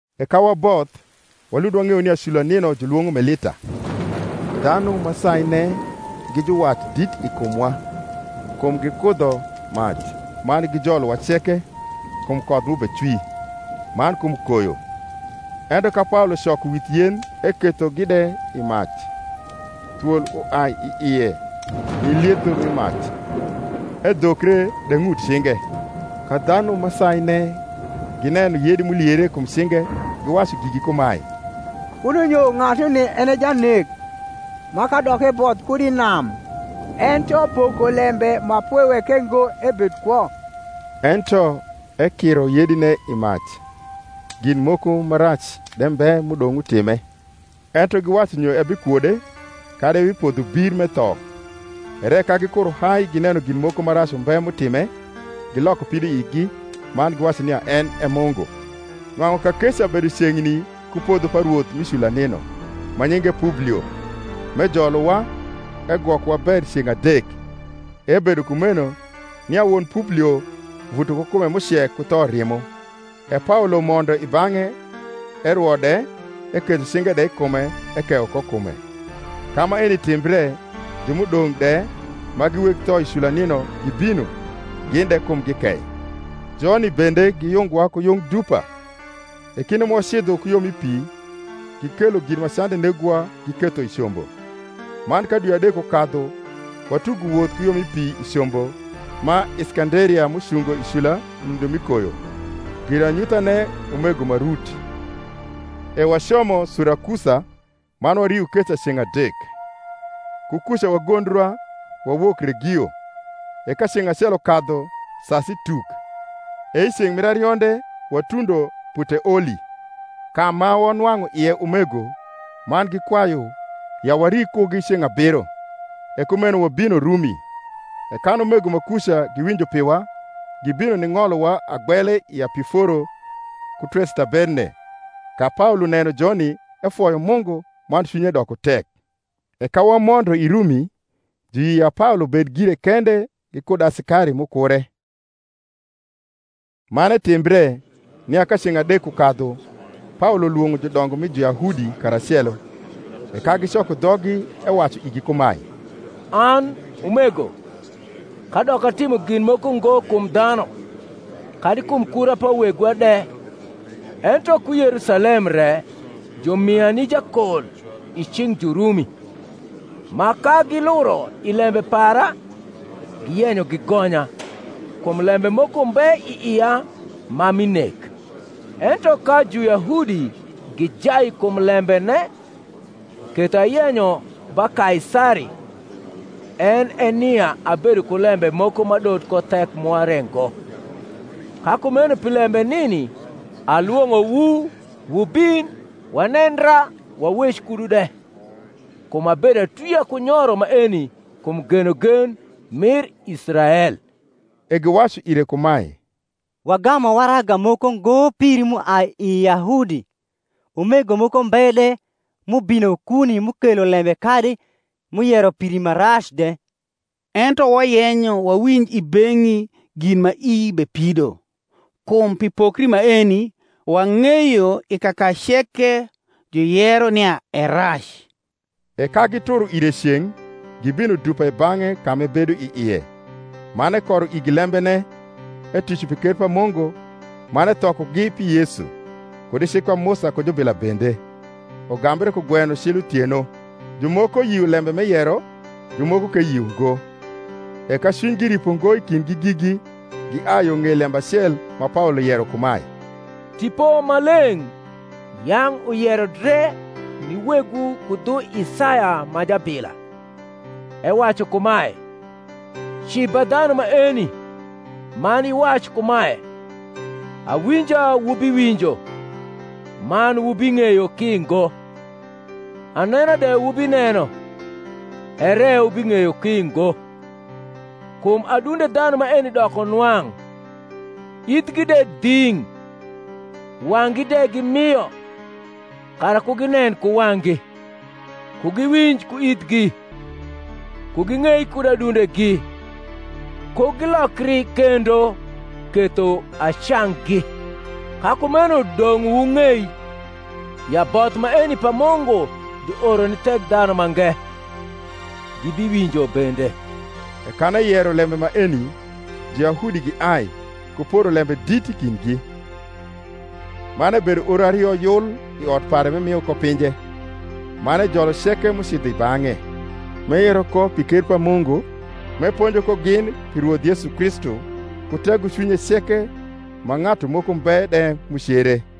E ka waboth, walund wang’eyo nia cula nino julwong’o Melita. Dhanu ma saine gi juwat dit i kumwa: kum gikudho mac, man gijolowa ceke, kum koth m’ubecwi, man kum koyo. Ento ka Paolo coko with yen ekethogi de i mac, thwol uai i ie ni lietho mi mac, edhokre de ng’ut cinge. Ka dhanu ma saine gineno yedi m’uliere kum cinge, giwacu gigi kumae, Kuno nyo ng’atuni en e janek, ma, kadok eboth kud i nam, ento Pokolembe ma pwe weke ngo ebed kwo. Ento ekiro yedine i mac, gin moko ma rac de mbe m’udong’ utime. Ento giwacu nyo ehikwodc, kadi ehipodho hir m’etho. ere ka gikuro hai gineno gin mokoma rac umbe m’utime, giloko pidoigi, man giwacu nia en e mungu. Nwang’u kakeca bedo ceng’ni ku podho pa rwoth mi cula nino, ma nyinge Publio; m’ejolowa, egwokowa ber ceng’ adek. E ebedo kumeno, nia won Publio vuto ku kume m’ucek ku thorimo: e Paolo mondo i bang’e, erwo de, eketho cinge de i kume ekeyo ko kume. Ka maeni timbre, ju m’udong’ de ma gi weg tho i cula nino gibino, gin de kumgi kei: joni bende giyungowa ku yung dupa; e kinde ma wacidho ku yo mi pi, gikelo gin ma cande negowa giketho i combo. Man ka dwi adek ukadhu watugo woth ku yo mi pi i combo ma Iskanderia m’ucungo i cula i nindo mi koyo, giranyuthane Umego ma Rut. E wacomo Surakusa, man wario keca ceng’ adek. Ku kuca wagondra, wawok Regio: e ka ceng’ acel ukadhu sasi tuk, e i ceng’ mir arionde watundo Puteoli; ka ma wanwang’u ie umego, man gikwayu ya wari kugi ceng’ abiro: e kumeno wabino Rumi. E kan umego ma kuca, giwinjo piwa, gibino ning’olowa agbele i Apiforo ku Trestaberne: ka Paolo neno joni, efoyo Mungu, man cwinye doko tek. E ka wamondo i Rumi, juyio ya Paolo bed gire kende gikud asikari m’ukure. Man etimbre, nia ka ceng’ adek ukadhu Paolo lwong’o judongo mi Juyahudi karacelo: e ka gicoko dhoggi, ewacu igi kumae, An, umego, kadok atimo gin moko ngo kum dhanu, kadi kum kura pa wegwa de, ento ku Yerusalem re jumia ni jakol i cing’ Jurumi: ma, ka giluro i lembe para, giyenyo gigonya, kum lembe moko mbe i ia ma mi nek. Ento ka Juyahudi gijai kum lembene, ketho ayenyo ba Kaisari: en e nia abedo ku lembe moko m’adot ko thek mwa re ngo. Ka kumeno pi lembe nini alwong’owu wubin wanendra wawec kudu de: kum abedo atwia ku nyoro maeni kum genogen mir Israel. E giwacu ire kumae, Wagamu waraga moko ngo piri m’uai i Yahudi, umego moko mbe de m’ubino kuni m’ukelo lembe kadi m’uyero piri ma rac de. Ento wayenyo wawinj i beng’i gin ma ii bepido: kum pi pokri maeni, wang’eyo i kaka ceke juyero nia e rac. E ka gituro ire ceng’, gibino dupa i bang’e ka m’ebedo i ie; man ekoro igi lembene, etuco pi kcr pa Mungu, man ethokogi pi Yesu, kud i cik pa Musa ku jubila bende, ugambre kugweno cil uthieno. Jumoko yio lembe m’eyero, jumoko ke yio ngo. E ka cwinygi ripo ngo i kindgi gigi, giai yo ng’ei lembe acel ma Paolo yero kumae, Tipo Maleng’ yang’ uyero dre ni wegwu ku dhu Isaya ma jabila, ewacu kumae, Ci ba dhanu maeni, man iwac kumae, Awinja wubiwinjo, man wubing’eyo ki ngo; Anena de wubineno, ere wubing’eyo ki ngo: Kum adunde dhanu maeni doko nwang’, Ithgi de dhing’, Wang’gi de gimio; Kara ku ginen ku wang’gi, Ku giwinj ku ithgi, Ku giug’ei kud adundegi, Ku gilokri kendo, Ketho acanggi. Ka kumeno dong’ wung’ei, ya both maeni pa Mungu juoro ni Thekdhanumange: gibiwinjo bende. E kan eyero lembe maeni, Juyahudi giai, ku poro lembe dit i kindgi. Man ebedo oro ario yul i ot pare m’emio ko pinje, man ejolo ceke m’ucidho i bang’e, m’eyero ko pi ker pa Mungu, m’eponjo ko gin pi Rwoth Yesu Kristu ku tegocwinye ceke, ma ng’atu moko mbe de m’ucere.